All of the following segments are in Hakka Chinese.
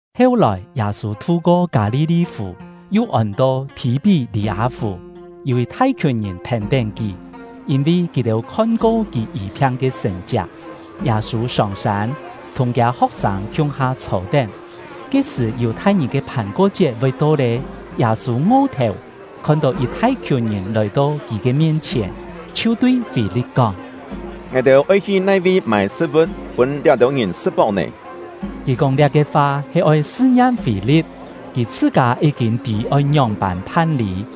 Heu-lòi, Yâ-sû thu-ko Kâ-li-li-fù (yu ôn-to Thì-pí-lî-â-fù). Yû yit thai-khiùn ngìn thèn-tén kì, yîn-vi kì-têu khon-ko kì yî-phiang ke sṳ̀n-chiak. Yâ-sû sông-sân, thùng kiâ ho̍k-sâng khiung-ha chhô-tén. Ke-sṳ̀ Yù-thai-ngìn ke Phàn-ko-chiet voi to lé. Yâ-sû ngo-thèu, khon-tó yit thai-khiùn ngìn lòi-to kì ke mien-chhièn, chhiu tui Fî-li̍t kóng: “Ngài-têu oi hi nai-vi mâi sṳ̍t-vu̍t, pûn liá-têu ngìn sṳ̍t-páu nè?” (Kì kóng liá-ke fa he oi sṳ-ngiam Fî-li̍t; kì chhṳ-kâ yí-kîn tî oi ngióng-pân phan-lî.)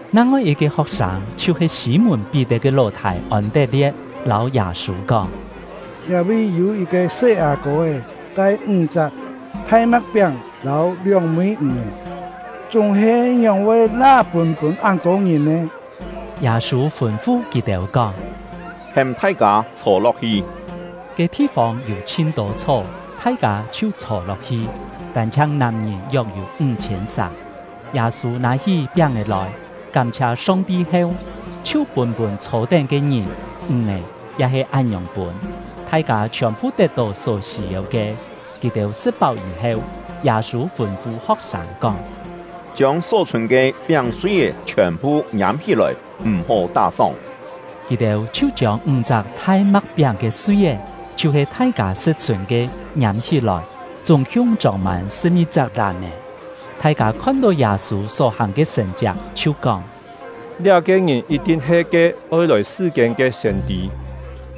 Nang-ngoi yit-ke ho̍k-sâng, chhiu-he Sî-mùn-Pí-tet ke ló-thâi Ôn-tet-lie̍t, lâu Yâ-sû kóng: “Liá-vi yû yit-ke se-â-kô-é tai ńg-chak thai ma̍k-piáng lâu lióng-mî ǹg-è, chúng-he ngióng-voi la pûn-pûn án-tô ngìn nè?” Yâ-sû fûn-fu kì-têu kóng: “Hêm thai-kâ chhô-lo̍k-hi.” (Ke thi-fông yû chhin-tô chhó.) Thai-kâ chhiu chhô-lo̍k-hi, tân-chhiang nàm-ngìn yok-yû ńg-chhiên sà. Yâ-sû nâ-hí piáng-è lòi, kám-chhia Song-ti heu, chhiu pûn-pûn chhô-tén ke ngìn; ǹg-è ya he án-ngiòng pûn; thai-kâ chhiòn-phu tet-tó só sî-yeu ke. Kì-têu sṳ̍t-páu yî-heu, Yâ-sû fûn-fu ho̍k-sâng kóng: “Chiông só chhûn ke piáng-sui-é chhiòn-phu ngiâm-hí-lòi, m̀-hó tá-sóng.” Kì-têu chhiu chiông ńg-chak thai ma̍k-piáng ke sui-é, chhiu-he thai-kâ sṳ̍t-chhûn ke, ngiâm-hí-lòi, chúng-khiung chông-mân sṳ̍p-ngi-chak làm-è. Thai-kâ khon-tó Yâ-sû só-hàng ke sṳ̀n-chiak, chhiu kóng: “Liá-ke ngìn yit-thin he ke oi lòi sṳ-kiên ke siên-tî!”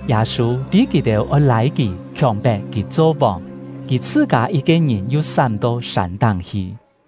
Yâ-sû tî kì-têu oi lâi kì, khiòng-pet kì cho vòng, kì chhṳ-kâ yit-ke ngìn yu sám-to sân-táng hi.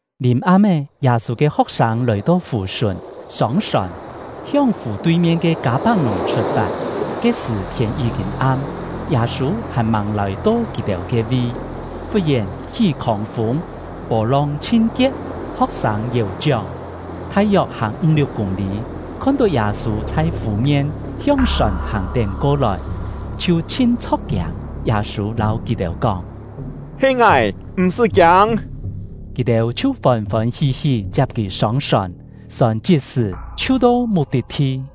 Lìm-am-é, Yâ-sû ke ho̍k-sâng lòi-to fù-sùn, sông-sòn, hiong fù tui-mien ke Kâ-pak-nùng chhut-fat. Ke-sṳ̀ thiên yí-kîn am, Yâ-sû hàn-màng lòi-to kì-têu ke-vi. Fut-yèn hí khòng-fûng, pô-long chhin-kie̍p. Ho̍k-sâng yèu-chióng, thai-yok hàng ńg-liuk kûng-lî, khon-tó Yâ-sû chhai fù-mien hiong sòn hàng-tén ko-lòi, chhiu chhin chho̍k-kiâng. Yâ-sû lâu kì-têu kóng: “He ngài, m̀-sṳ́ kiâng!” Kì-têu chhiu fôn-fôn hí-hí chiap kì sông-sòn; sòn chit-sṳ̀ chhiu to muk-tit-thi.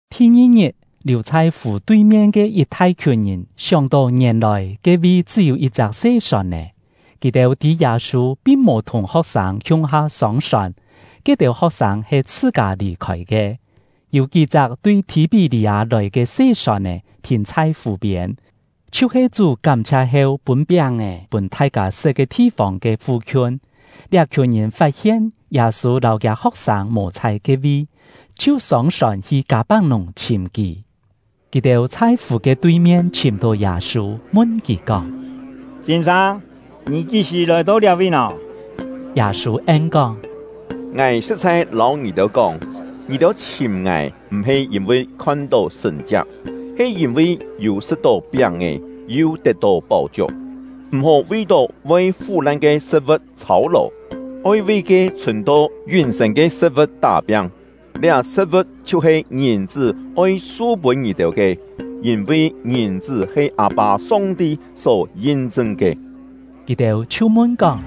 Thi-ngi-ngit, liù chhai fù tui-mien ke yit thai-khiùn ngìn sióng-tó ngièn-lòi ke-vi chṳ́-yû yit-chak se sòn-è; kì-têu tî Yâ-sû pin mò thùng ho̍k-sâng khiung-ha sông-sòn, ke-têu ho̍k-sâng he chhṳ-kâ lì-khôi ke. Yû kí-chak tui Thì-pí-lî-â lòi ke se sòn-è thìn chhai fù-piên, chhiu-he Chú kám-chhia heu pûn piáng-è pûn thai-kâ sṳ̍t ke thi-fông ke fu-khiun. Liá-khiùn ngìn fat-hien Yâ-sû lâu kiâ ho̍k-sâng mò chhai ke-vi, chhiu sông-sòn hi Kâ-pak-nùng chhìm kì. Kì-têu chhai fù ke tui-mien chhìm-tó Yâ-sû, mun kì kóng: “Sîn-sâng, ngì kí-sṳ̀ lòi-to liá-vi nò?” Yâ-sû en-kóng: “Ngài sṳ̍t-chhai lâu ngì-têu kóng, ngì-têu chhìm ngài, m̀-he yîn-vi khon-tó sṳ̀n-chiak, he yîn-vi yû sṳ̍t-tó piáng-è, yu tet-tó páu-chiuk. M̀-hó vi-tó voi fú-lan ke sṳ̍t-vu̍t chhâu-lò, oi vi ke chhùn-to yún-sên ke sṳ̍t-vu̍t tá-piang. Liá sṳ̍t-vu̍t chhiu-he Ngìn-chṳ́ oi su-pûn ngì-têu ke, yîn-vi Ngìn-chṳ́ he Â-pâ Song-ti só yin-chṳn ke.” Kì-têu chhiu mun-kóng: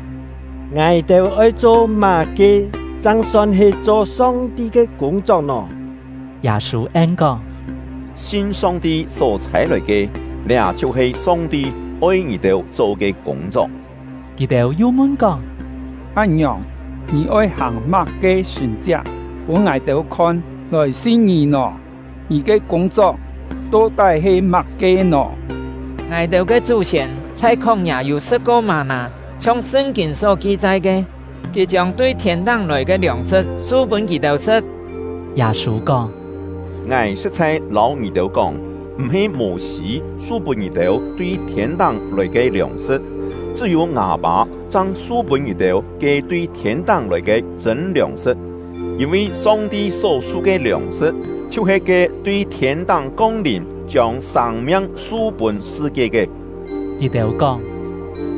“Ngài-têu oi cho má-ke chang son he cho Song-ti ke kûng-chok nò?” Yâ-sû en-kóng: “Sin Song-ti só chhâi-lòi ke, liá chhiu-he Song-ti oi ngì-têu cho ke kûng-chok.” Kì-têu yu mun-kóng: “Án-ngiòng, ngì oi hàng má-ke sṳ̀n-chiak pûn ngài-têu khon lòi sin ngì nò? Ngì ke kûng-chok to-tái he má-ke nò? Ngài-têu ke chú-siên chhai khóng-yâ yû sṳ̍t-ko mâ-nâ, chhiong Sṳn-kîn só ki-chai ke: ‘Kì chiông tui thiên-táng lòi ke liòng-sṳ̍t su-pûn kì-têu sṳ̍t.’” Yâ-sû kóng: “Ngài sṳ̍t-chhai lâu ngì-têu kóng, m̀-he Mô-sî su-pûn ngì-têu tui thiên-táng lòi ke liòng-sṳ̍t; chṳ́-yû ngâ Pâ chang su-pûn ngì-têu ke tui thiên-táng lòi ke chṳ̂n liòng-sṳ̍t. Yîn-vi Song-ti só-su ke liòng-sṳ̍t chhiu-he ke tui thiên-táng kong-lìm, chiông sâng-miang su-pûn sṳ-kie ke.” Kì-têu kóng: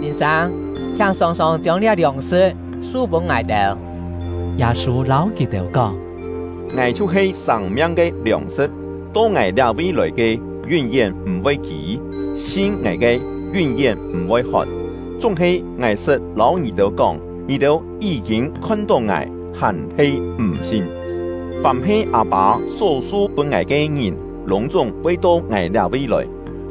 “Sîn-sâng, chhiáng sòng-sòng chiông liá liòng-sṳ̍t su-pûn ngài-têu!” Yâ-sû lâu kì-têu kóng: “Ngài chhiu-he sâng-miang ke liòng-sṳ̍t. To ngài liá-vi lòi ke, yún-yén m̀-voi kî; sin ngài ke, yún-yén m̀-voi hot. Chúng-he ngài sṳt lâu ngì-têu kóng, ngì-têu yí-kîn khon-tó ngài, hàn-he m̀ sin. Fàm he Â-pâ só su-pûn ngài ke ngìn lûng-chúng voi to ngài liá-vi lòi.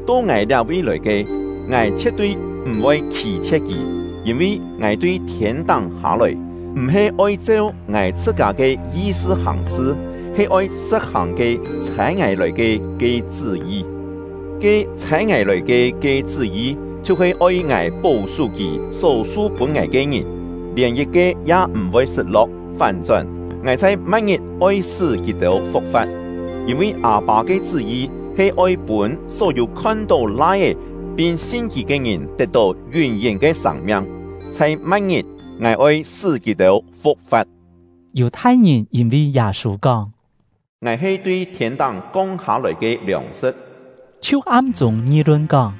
To ngài liá-vi lòi ke, ngài chhie̍t-tui m̀-voi khî-chhie̍t kì; yîn-vi ngài tui thiên-táng hâ-lòi, m̀-he oi cheu ngài chhṳ-kâ ke yi-sṳ hàng-sṳ, he oi sṳ̍t-hàng ke ‘Chhâi ngài lòi ke’ ke chṳ́-yi. Ke ‘Chhâi ngài lòi ke’ ke chṳ́-yi, chhiu-he oi ngài pó-sú Kì só su-pûn ngài ke ngìn, lièn yit-ke ya m̀-voi sṳt-lo̍k, fán-chón, ngài chhai ma̍t-ngit oi sṳ́ kì-têu fu̍k-fa̍t. Yîn-vi Â-pâ ke chṳ́-yi he oi pûn só-yû khon-tó Lai-é pin sin kì ke ngìn tet-tó yún-yén ke sâng-miang; chhai ma̍t-ngit, ngài oi sṳ́ kì-têu fu̍k-fa̍t.” Yù-thai-ngìn yîn-vi Yâ-sû kóng: “Ngài he tui thiên-táng kong hâ-lòi ke liòng-sṳ̍t”, chhiu am-chûng ngi-lun kóng: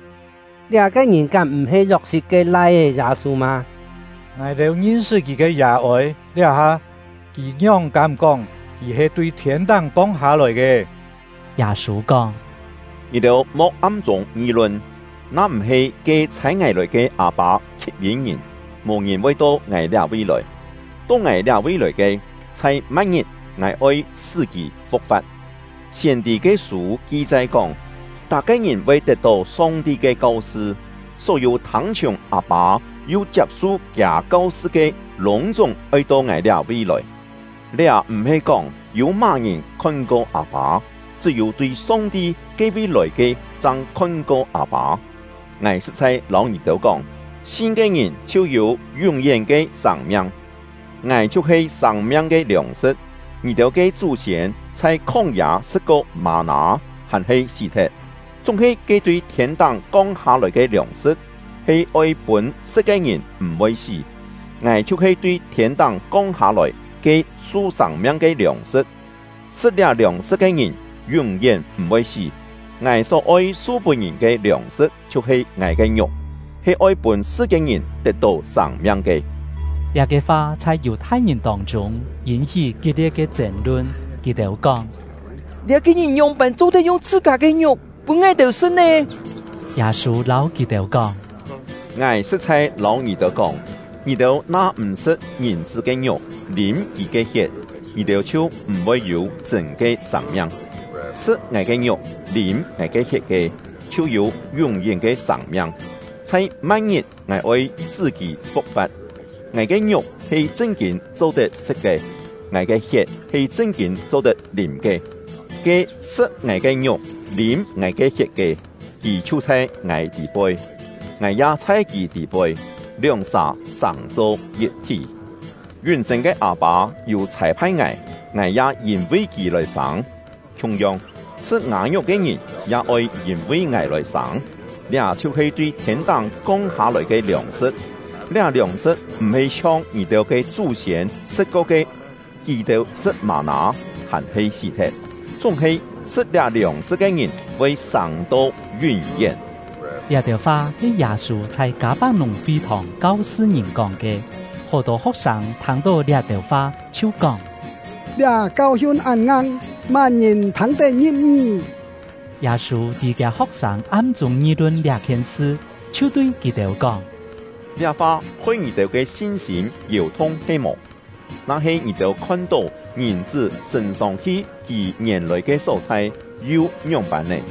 “Liá-ke ngìn kám m̀-he Yok-sit ke lai-é Yâ-sû mâ? Ngài-têu ngin-sṳt kì ke yà-ôi. Liá-ha, kì ngióng kám-kóng kì he tui thiên-táng kong hâ-lòi ke!” Yâ-sû kóng: “Ngì-têu mo̍k am-chûng ngi-lun. Na-m̀-he ke chhâi ngài lòi ke Â-pâ khip-yîn ngìn, mò-ngìn voi to ngài liá-vi lòi; to ngài liá-vi lòi ke, chhai ma̍t-ngit ngài oi sṳ́ kì fu̍k-fa̍t. Siên-tî ke sû ki-chai kóng: ‘Tak-ke ngìn voi tet-tó Song-ti ke kau-sṳ.’ Só-yû thâng-chhiùng Â-pâ yu chiap-su Kiâ kau-sṳ ke, lûng-chúng oi to ngài liá-vi lòi. Liá m̀-he kóng yû má-ngìn khon-ko Â-pâ; chṳ́-yû tui Song-ti ke-vi lòi ke chang khon-ko Â-pâ. Ngài sṳ̍t-chhai lâu ngì-têu kóng, sin ke ngìn chhiu yû yún-yén ke sâng-miang. Ngài chhiu-he sâng-miang ke liòng-sṳ̍t. Ngì-têu ke chú-siên chhai khóng-yâ sṳ̍t-ko mâ-nâ, hàn-he sí-thet; chúng-he ke tui thiên-táng kong hâ-lòi ke liòng-sṳ̍t he oi pûn sṳ̍t ke ngìn m̀-voi sí. Ngài chhiu-he tui thiên-táng kong hâ-lòi, ke su sâng-miang ke liòng-sṳ̍t; sṳ̍t liá liòng-sṳ̍t ke ngìn yún-yén m̀-voi sí. Ngài só-oi su-pûn ngìn ke liòng-sṳ̍t chhiu-he ngài ke ngiuk, he oi pûn sṳ-kiên-ngìn tet-tó sâng-miang ke.” Liá-ke fa chhai Yù-thai-ngìn tông-chûng yîn-hí kit-lie̍t ke chên-lun. Kì-têu kóng: “Liá-ke ngìn ngióng-pân cho-tet yung chhṳ-kâ ke ngiuk pûn ngài-têu sṳ̍t nè?” Yâ-sû lâu kì-têu kóng: “Ngài sṳ̍t-chhai lâu ngì-têu kóng, ngì-têu na m̀ sṳ̍t Ngìn-chṳ́ ke ngiuk, lîm kì ke hiet, ngì-têu chhiu m̀-voi yû chṳ̂n ke sâng-miang. Sṳ̍t ngài ke ngiuk, lîm ngài ke hiet ke, chhiu yû yún-yén ke sâng-miang; chhai ma̍t-ngit ngài oi sṳ́ kì fu̍k-fa̍t. Ngài ke ngiuk he chṳn-kîn cho-tet sṳ̍t ke, ngài ke hiet he chṳn-kîn cho-tet lîm ke. Ke sṳ̍t ngài ke ngiuk, lîm ngài ke hiet ke, kì chhiu chhai ngài tî-poi, ngài ya chhai kì tî-poi, lióng-sà sàng-cho yit-thí. Yún-sên ke Â-pâ yû chhâi-phai ngài, ngài ya yîn-vi Kì lòi sâng; khiung-yong, sṳ̍t ngâ ngiuk ke ngìn ya oi yîn-vi ngài lòi sâng. Liá chhiu-he tui thiên-táng kong hâ-lòi ke liòng-sṳ̍t. Liá liòng-sṳ̍t m̀-he chhiong ngì-têu ke chú-siên sṳ̍t-ko ke, kì-têu sṳ̍t mâ-nâ, hàn-he sí-thet; chúng-he sṳ̍t liá liòng-sṳ̍t ke ngìn voi sâng-to yún-yén.” Liá-têu fa he Yâ-sû chhai Kâ-pak-nùng fi-thòng kau-sṳ ngìn kóng ke. Hó-tô ho̍k-sâng thâng-tó liá-têu fa, chhiu kóng: “Liá kau-hiun án ngang, má-ngìn thâng-tet ngi̍p-ngí?” Yâ-sû tî kiâ ho̍k-sâng am-chûng ngi-lun liá-khien sṳ, chhiu tui kì-têu kóng: “Liá fa hoi ngì-têu sin-sîm yèu-thung he-mò? Na-he ngì-têu khon-tó Ngìn-chṳ́ sṳ̂n-sông-hi kì ngièn-lòi ke só-chhai, yu ngióng-pân nè?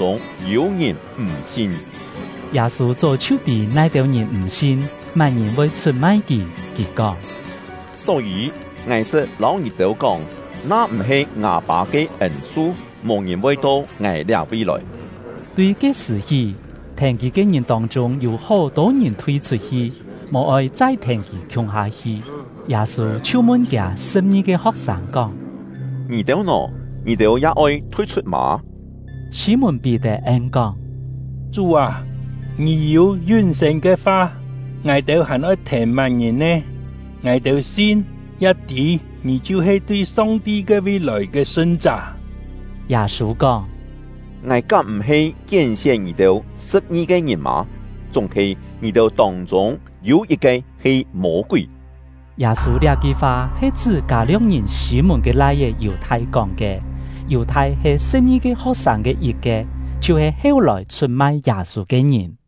Chúng-he ngì-têu tông-chûng yû ngìn m̀ sin.” (Yâ-sû chó chhiu tî nai-têu ngìn m̀ sin, má-ngìn voi chhut-mai kì.) Kì kóng: “Só-yî, ngài sṳt lâu ngì-têu kóng, na-m̀-he ngâ Pâ ke ên-su, mò-ngìn voi to ngài liá-vi lòi.” Tui ke-sṳ̀ hí, thèn kì ke ngìn tông-chûng yû hó-tô ngìn thui-chhut-hi, mò-oi chai thèn kì khiung-ha hi. Yâ-sû chhiu mun kiâ sṳ̍p-ngi-ke ho̍k-sâng kóng: “Ngì-têu nò? Ngì-têu ya oi thui-chhut mâ?” Sî-mùn-Pí-tet en-kóng: “Chú â, ngì yû yún-sên ke fa, ngài-têu hàn oi thèn má-ngìn nè? Ngài-têu sin, ya tî ngì chhiu-he tui Song-ti ke-vi lòi ke Sṳn-chá.” Yâ-sû kóng: “Ngài kám m̀-he kién-sién ngì-têu sṳ̍p-ngi-ke ngìn mâ? Chúng-he ngì-têu tông-chûng yû yit-ke he Mô-kúi!” Yâ-sû liá-ki fa he chṳ́ Kâ-lio̍k-ngìn Sî-mùn ke lai-é Yù-thai kóng ke. Yù-thai he sṳ̍p-ngi-ke ho̍k-sâng ke yit-ke, chhiu-he heu-lòi chhut-mai Yâ-sû ke ngìn.